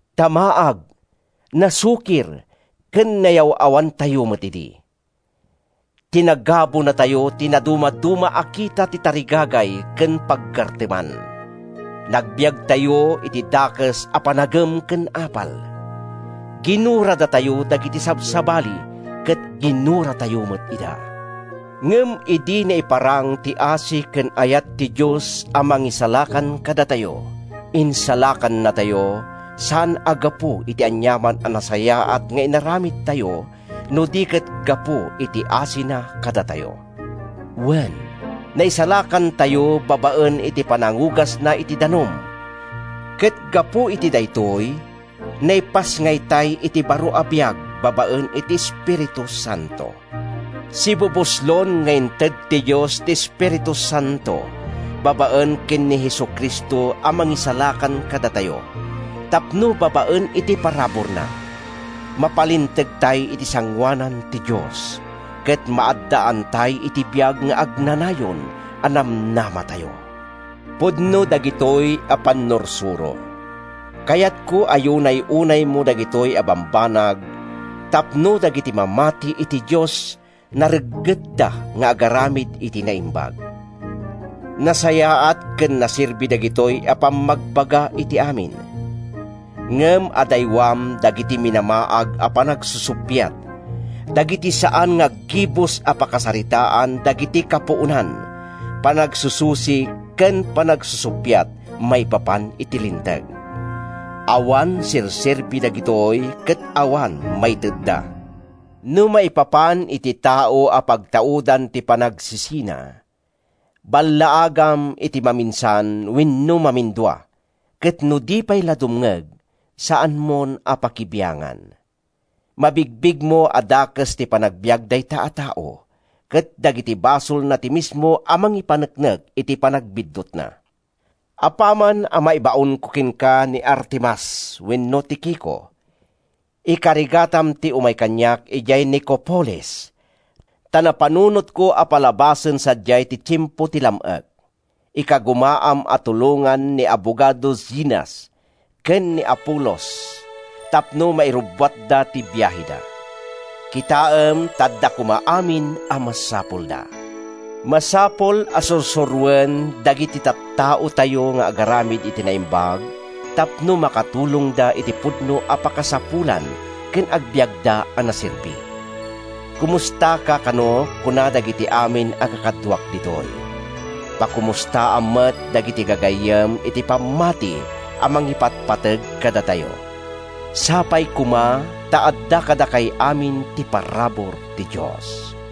Ta maag, nasukir ken nayaw-awantayo met idi. Tinagabunatayo ti nadumaduma a kita ti tarigagay ken paggarteman. Nagbiagtayo iti dakes a panagem ken apal. Ginuradatayo dagiti sabsabali ket ginuratayo met ida. Ngem idi naiparang ti asi ken ayat ti Dios a Mangisalakan kadatayo, insalakannatayo, saan a gapu iti aniaman a nasayaat nga inaramidtayo no di ket gapu iti asina kadatayo. Wen, naisalakantayo babaen iti panangugasna iti danum, ket gapu iti daytoy, naipasngaytay iti baro a biag babaen iti Espiritu Santo. Sibubuslon nga inted ti Dios ti Espiritu Santo babaen ken ni Jesu-Cristo a Mangisalakan kadatayo tapno babaen iti paraburna, mapalintegtay iti sangoanan ti Dios ket maaddaantay iti biag nga agnanayon a namnamatayo. Pudno dagitoy a pannursuro. Kayatko a yunay-unaymo dagitoy a bambanag tapno dagiti mamati iti Dios nareggetda nga agaramid iti naimbag. Nasayaat ken naserbi dagitoy a pammagbaga iti amin. Ngem adaywam dagiti minamaag a panagsusuppiat, dagiti saan nga aggibus a pakasaritaan dagiti kapuonan, panagsususik ken panagsusuppiat maipapan iti Linteg. Awan serserbi dagitoy ket awan maitedda. No maipapan iti tao a pagtaudan ti panagsisina, ballaagam iti maminsan wenno mamindua ket no di pay la dumngeg, saanmon a pakibiangan. Mabigbigmo a dakes ti panagbiag dayta a tao, ket dagiti basolna ti mismo a mangipaneknek iti panagbiddutna. Apaman a maibaonko kenka ni Artemas wenno ni Tikico, ikarigatam ti umay kaniak idiay Nicopolis, ta napanunotko a palabasen sadiay ti tiempo ti lam-ek. Ikagumaam a tulongan ni abogado Zenas ken ni Apolos tapno mairubbuatda ti biaheda. Kitaem ta adda koma amin a masapulda. Masapul a sursuroen dagiti tattaotayo nga agaramid iti naimbag tapno makatulongda iti pudno a pakasapulan ken agbiagda a naserbi. Komustaka kano kuna dagiti amin a kakaduak ditoy. Pakomustaam met dagiti gagayyem iti pammati a mangipatpateg kadatayo. Sapay koma ta adda kadakay amin ti parabur ti Dios.